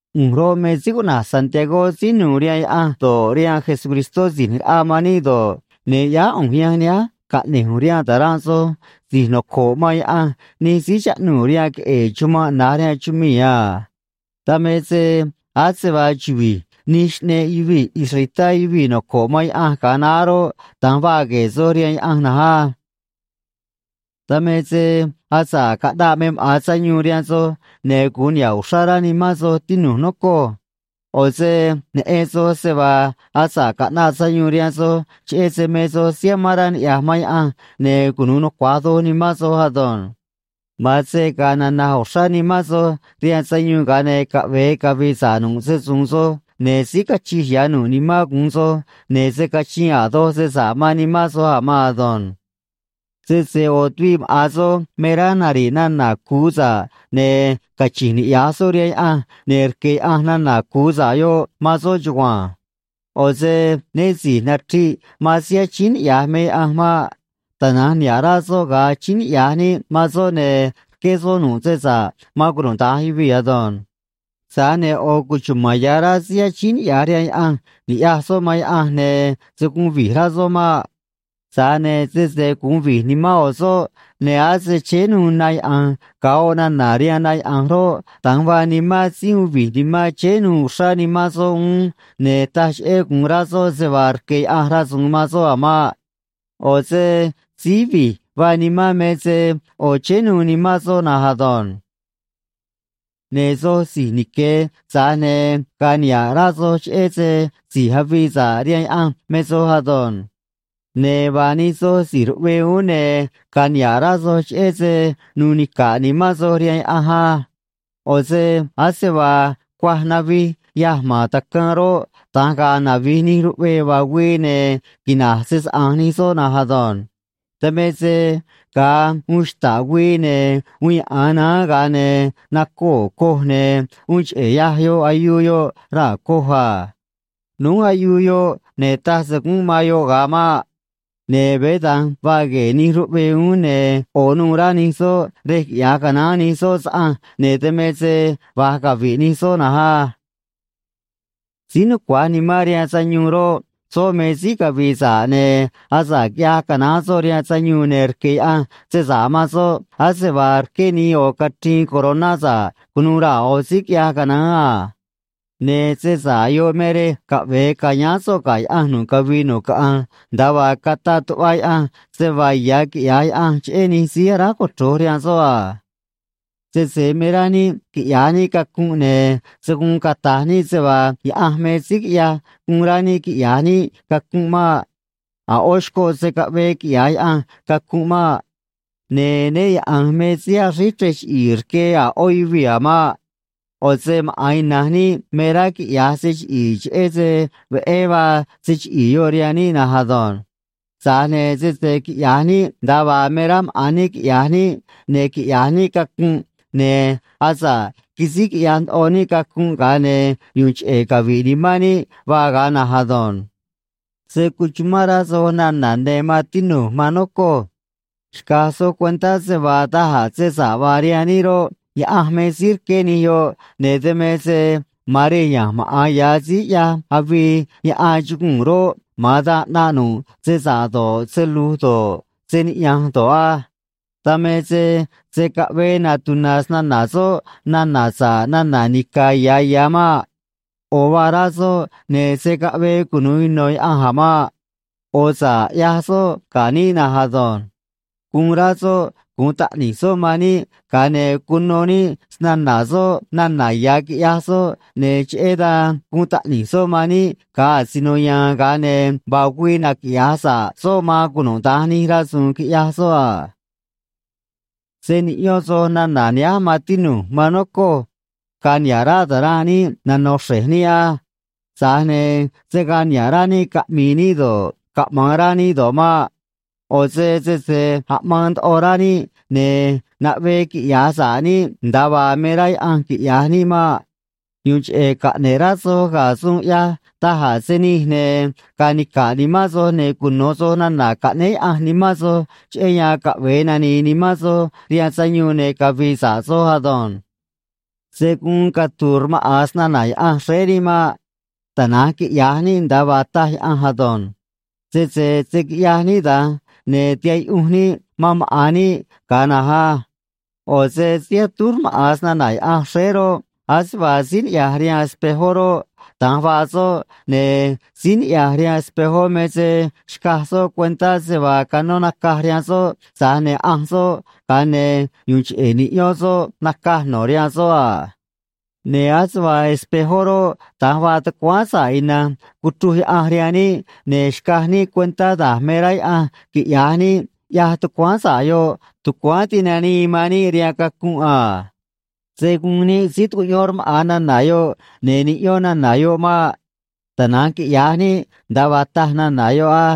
ꞌU̱nj roꞌ, me síí cuꞌna̱j Santiagó, síí nu̱u̱ rihaan Yaꞌanj do̱ꞌ, rihaan Jesucristó Si̱j ꞌNi̱j Raꞌa man níꞌ do̱ꞌ, ne̱ ꞌyáá ꞌu̱nj yanj nihánj caꞌne̱j ꞌu̱nj rihaan ta̱ranꞌ soj si̱j noco̱ꞌ man Yaꞌanj nij síí chaꞌnuu̱ rihaan queꞌe̱e̱ chumanꞌ na̱j rihaan chumii̱ a. Dan me se ase vaa chuvi̱j nij xꞌneꞌ yuvii̱ israelitá yuvii̱ noco̱ꞌ man Yaꞌanj ga̱a naá roꞌ, da̱nj vaa gue̱e̱ soj rihaan Yaꞌanj na̱nj á. Dan me se asa̱ꞌ caꞌnaꞌ me maꞌa̱n sayuun rihaan soj, ne̱ gu̱un niha̱ꞌ uxrá rá nimán soj, tinu̱j, nocoj. ꞌO̱ se neꞌen soj se vaa asa̱ꞌ caꞌnaꞌ sayuun rihaan soj cheꞌé se me soj síí amán rá niꞌya̱j man Yaꞌanj, ne̱ cunu̱u nucua̱j doj nimán soj ado̱nj. Ma̱an se ga̱a̱ nana̱j uxrá nimán soj rihaan sayuun, ga̱a ne̱ caꞌve̱e cavi̱i̱ sa̱ꞌ nu̱ꞌ se‑su̱u̱n soj, ne̱ síí cachij ya̱ nu̱ꞌ nimán gu̱un soj, ne̱ se̱ cachiin a̱ doj se sa̱ꞌ man nimán soj a̱ maan ado̱nj. Sese ꞌo̱ tuviꞌ maꞌa̱n soj me rá nari̱ꞌ nana̱ cu̱u sa̱ꞌ, ne̱ cachi̱nj niꞌya̱j soꞌ rihaan Yaꞌanj, ne̱ rque̱ Yaꞌanj nana̱ cu̱u sa̱ꞌ yoꞌ man soꞌ chugua̱nj. ꞌO̱ se né si̱j nachriꞌ man síí achíín niꞌya̱j me Yaꞌanj maꞌ. Tana̱nj niha̱ꞌ rá soꞌ ga̱a achíín níꞌ man soꞌ, ne̱ rqué soꞌ nu̱ꞌ se sa̱ꞌ man cunuda̱nj yuvii̱ ado̱nj. Tza̱j ne̱ ꞌo̱ cuchuma̱n ya̱ rá síí achíín niꞌya̱j rihaan Yaꞌanj ni̱ꞌyaj soꞌ man Yaꞌanj, ne̱ se̱ guun vi̱j rá soꞌ maꞌ. Tza̱j ne̱ sese guun vi̱j nimán ꞌo̱ soꞌ, ne̱ ase chéé nuû na yaꞌa̱nj ga̱a oꞌ nana̱ rihaan na yaꞌa̱nj roꞌ, da̱nj vaa nimán síí uun vi̱j nimán, chéé nuû uxrá nimán soꞌ uún, ne̱ taj cheꞌé gu̱un rá soꞌ se vaa rque̱ Yaꞌanj rasu̱u̱n man soꞌ a̱ maꞌ. ꞌO̱ se síí vi̱j vaa nimán me se ꞌo̱ chéé nuû nimán soꞌ na̱nj ado̱nj. Ne̱ soj si̱j nique̱, tza̱j ne̱ ga̱a̱ niha̱ꞌ rá soj cheꞌé se si̱j avii sa̱ꞌ rihaan Yaꞌanj me soj ado̱nj. Ne̱ vaa nij soj si̱j ruꞌvee uún, ne̱ ga̱a̱ niha̱ꞌ rá soj cheꞌé se nuu nica̱ꞌ nimán soj rihaan Yaꞌanj á. ꞌO̱ se ase vaa cuaj navij yâj ma̱n tacaan roꞌ, da̱nj ga̱a̱ navi̱j nij ruꞌvee vaa güii, ne̱ quina̱j se‑saꞌa̱nj nij soꞌ na̱nj ado̱nj. Dan me se ga̱a uun xta̱ꞌ güii, ne̱ uun yaꞌa̱an naán, ga̱a ne̱ nacoo̱ coj, ne̱ uun cheꞌe̱ yâj yoꞌ ayuu yoꞌ raa̱ coj a. Núj ayuu yoꞌ, ne̱ taj se gúnꞌ man yoꞌ ga̱a maꞌ. Ne̱ veé da̱nj vaa gue̱e̱ nij ruꞌvee uún, ne̱ ꞌo̱ nuû rá nij soꞌ rej quiꞌya̱j canaán nij soꞌ saꞌanj, ne̱ dan me se va̱j cavi̱ꞌ nij soꞌ na̱nj á. Síí nucua̱j nimán rihaan sayuun roꞌ, soꞌ me síí cavi̱i̱ sa̱ꞌ, ne̱ asa̱ꞌ quiꞌyaj canáán soꞌ rihaan sayuun, ne̱ rque̱ Yaꞌanj se sa̱ꞌ man soꞌ ase vaa rqué nii ꞌo̱ cachriin coroná sa̱ꞌ cu̱nuû raa̱ ꞌo̱ síí quiꞌyaj canaán a. Ne̱ se sa̱ꞌ yoꞌ me rej caꞌve̱e ca̱yáán so̱ꞌ ga̱ Yaꞌanj nu̱ꞌ cavii nu̱ꞌ caꞌanj, nda̱a vaa cataꞌ tuꞌva Yaꞌanj se vaa ya̱ quiꞌya̱j Yaꞌanj cheꞌé nij síí aráj cochro̱j rihaan soꞌ a. Sese me rá níꞌ quiꞌya̱j níꞌ cacunꞌ, ne̱ se̱ guun cata̱j níꞌ se vaa Yaꞌanj me síí quiꞌyaj guun rá níꞌ quiꞌya̱j níꞌ cacunꞌ maꞌ. A̱ ꞌó xcoꞌ se̱ caꞌvee quiꞌya̱j Yaꞌanj cacunꞌ maꞌ. Ne̱ né Yaꞌa̱nj me síí axríj chrej chiꞌi̱i̱ rque a̱ ꞌó yuvii̱ a̱ maꞌ. ꞌO̱ se maꞌa̱n ina̱nj níꞌ me rá quiꞌya̱j se chiꞌi̱i̱ cheꞌé se veꞌé vaa se chiꞌi̱i̱ yoꞌ rihaan níꞌ na̱nj ado̱nj. Tza̱j ne̱ sese quiꞌya̱j níꞌ nda̱a vaa me rá maꞌa̱n níꞌ quiꞌya̱j níꞌ, ne̱ quiꞌya̱j níꞌ cacunꞌ, ne̱ asa̱ꞌ quisíj quiꞌyaj ndoꞌo níꞌ cacunꞌ, ga̱a ne̱ yu̱u̱n cheꞌe̱ cavi̱ꞌ nimán níꞌ vaa ga̱a na̱nj ado̱nj. Se̱ cuchumán rá soj nana̱ ne̱, maan tinu̱j, maan nocoj. Xca̱j soj cuentá se vaa da̱j a̱ se sa̱ꞌ vaa rihaan níꞌ roꞌ, Yaꞌanj me síí rqué nij yoꞌ, ne̱ dan me se ma̱an rej ya̱nj maꞌa̱n ya̱ síí ꞌyaj avii yaꞌan chuguu̱n roꞌ, ma̱an dan ꞌnaꞌ nu̱ꞌ se sa̱ꞌ do̱ꞌ, se lu̱j do̱ꞌ, se niꞌya̱nj do̱ꞌ á. Dan me se se̱ caꞌvee natuna̱ snana̱ soꞌ nana̱ sa̱ꞌ nana̱ nica̱ ya̱ ya̱ maꞌ. ꞌO̱ vaa rá soꞌ, ne̱ se̱ caꞌvee cunu̱u ino̱ Yaꞌanj a̱ maꞌ. ꞌO̱ sa̱ꞌ ꞌyaj soꞌ ga̱ níꞌ na̱nj ado̱nj. Guun rá soꞌ gu̱un taꞌni̱j soꞌ man níꞌ, ga̱a ne̱ cuno níꞌ snana̱ soꞌ nana̱ ya̱, quiꞌyaj soꞌ, ne̱ cheꞌé dan guun taꞌni̱j soꞌ man níꞌ ga̱a asino ya̱a̱n, ga̱a ne̱ vaa güii naquiꞌya̱j sa̱ꞌ soꞌ man cunuda̱nj nij rasu̱u̱n quiꞌyaj soꞌ a. Se̱ niꞌyón soj nana̱ nihánj, maan tinu̱j, maan nocoj. Ga̱a̱ niha̱ꞌ rá ta̱ranꞌ níꞌ nano̱ xre̱j níꞌ á. Tza̱j ne̱ se̱ gaa niha̱ꞌ rá níꞌ caꞌmi̱i̱ níꞌ do̱ꞌ, caꞌma̱an rá níꞌ do̱ꞌ maꞌ. ꞌO̱ se sese aꞌmaan ndoꞌo rá níꞌ, ne̱ naꞌvee quiꞌya̱j sa̱ꞌ níꞌ nda̱a vaa me rá Yaꞌanj quiꞌya̱j níꞌ maꞌ. Yu̱u̱n cheꞌe̱ caꞌne̱ꞌ rá soj ga̱ suun ꞌyaj da̱j a̱ se nij, ne̱ ga̱a̱ nica̱ꞌ nimán soj, ne̱ cuno̱ soj nana̱ caꞌnéé Yaꞌanj nimán soj, cheꞌé yan caꞌve̱e nani̱i̱ nimán soj rihaan sayuun ne̱ cavi̱i̱ sa̱ꞌ soj ado̱nj. Se̱ guun catu̱u̱ rmaꞌa̱n snana̱ Yaꞌanj xréé níꞌ maꞌ. Tana̱nj quiꞌya̱j níꞌ nda̱a vaa taj Yaꞌanj ado̱nj. Sese se̱ quiꞌyaj níꞌ da̱nj, ne̱ tiha̱ꞌ yuꞌunj níꞌ man maꞌa̱n níꞌ ga̱a na̱nj á. ꞌO̱ se síí atúj rmaꞌa̱n snana̱ Yaꞌanj xréé roꞌ, ase vaa síí niꞌya̱j rihaan espejó roꞌ, da̱nj vaa soꞌ, ne̱ síí niꞌya̱j rihaan espejó me se xcaj soꞌ cuentá se vaa canó nacaj rihaan soꞌ, tza̱j ne̱ ꞌanj soꞌ, ga̱a ne̱ yu̱u̱n cheꞌe̱ niꞌyón soꞌ nacaj no̱ rihaan soꞌ a. Ne̱ ase vaa espejó roꞌ, da̱nj vaa tucuáán sa̱ꞌ ina̱nj cuchruj Yaꞌanj rihaan níꞌ, ne̱ xcaj níꞌ cuentá da̱j me rá Yaꞌanj quiꞌya̱j níꞌ, ꞌyaj tucuáán sa̱ꞌ yoꞌ, tucuáán tinanii man níꞌ rihaan cacunꞌ a. Se̱ guun níꞌ síí tucuꞌyón rmaꞌa̱n nana̱ yoꞌ ne̱ niꞌyón nana̱ yoꞌ maꞌ. Tana̱nj quiꞌya̱j níꞌ nda̱a vaa taj nana̱ yoꞌ á.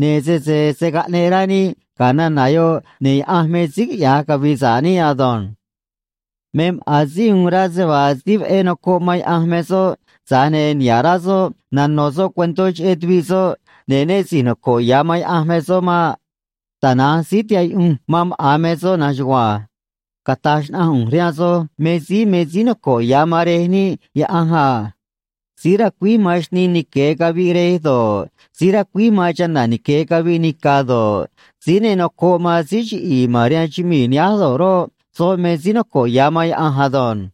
Ne̱ sese se̱ caꞌneꞌ rá níꞌ ga̱ nana̱ yoꞌ, ne̱ Yaꞌanj me síí quiꞌya̱j cavi̱i̱ sa̱ꞌ níꞌ ado̱nj. Me maꞌa̱n síí uun rá se vaa síí veꞌé nocoꞌ man Yaꞌanj me soꞌ, tza̱j ne̱ niha̱ꞌ rá soꞌ nano̱ soꞌ cuentó cheꞌé tuviꞌ soꞌ, ne̱ né si̱j noco̱ꞌ ya̱ man Yaꞌanj me soꞌ maꞌ. Tana̱nj síí tihaꞌ yuꞌunj man maꞌa̱n me soꞌ na̱nj chugua̱nj. Cata̱j xnaꞌanj ꞌu̱nj rihaan soj me síí me síí noco̱ꞌ ya̱ man Rej níꞌ Yaꞌanj a. Síí racuíj man xnii nique̱ caviꞌ rej do̱ꞌ, síí racuíj man chana̱ nique̱ caviꞌ nica̱ do̱ꞌ, síí ne nocoꞌ man síí chiꞌi̱i̱ ma̱n rihaan chumii̱ nihánj do̱ꞌ roꞌ, soꞌ me síí noco̱ꞌ ya̱ man Yaꞌanj ado̱nj.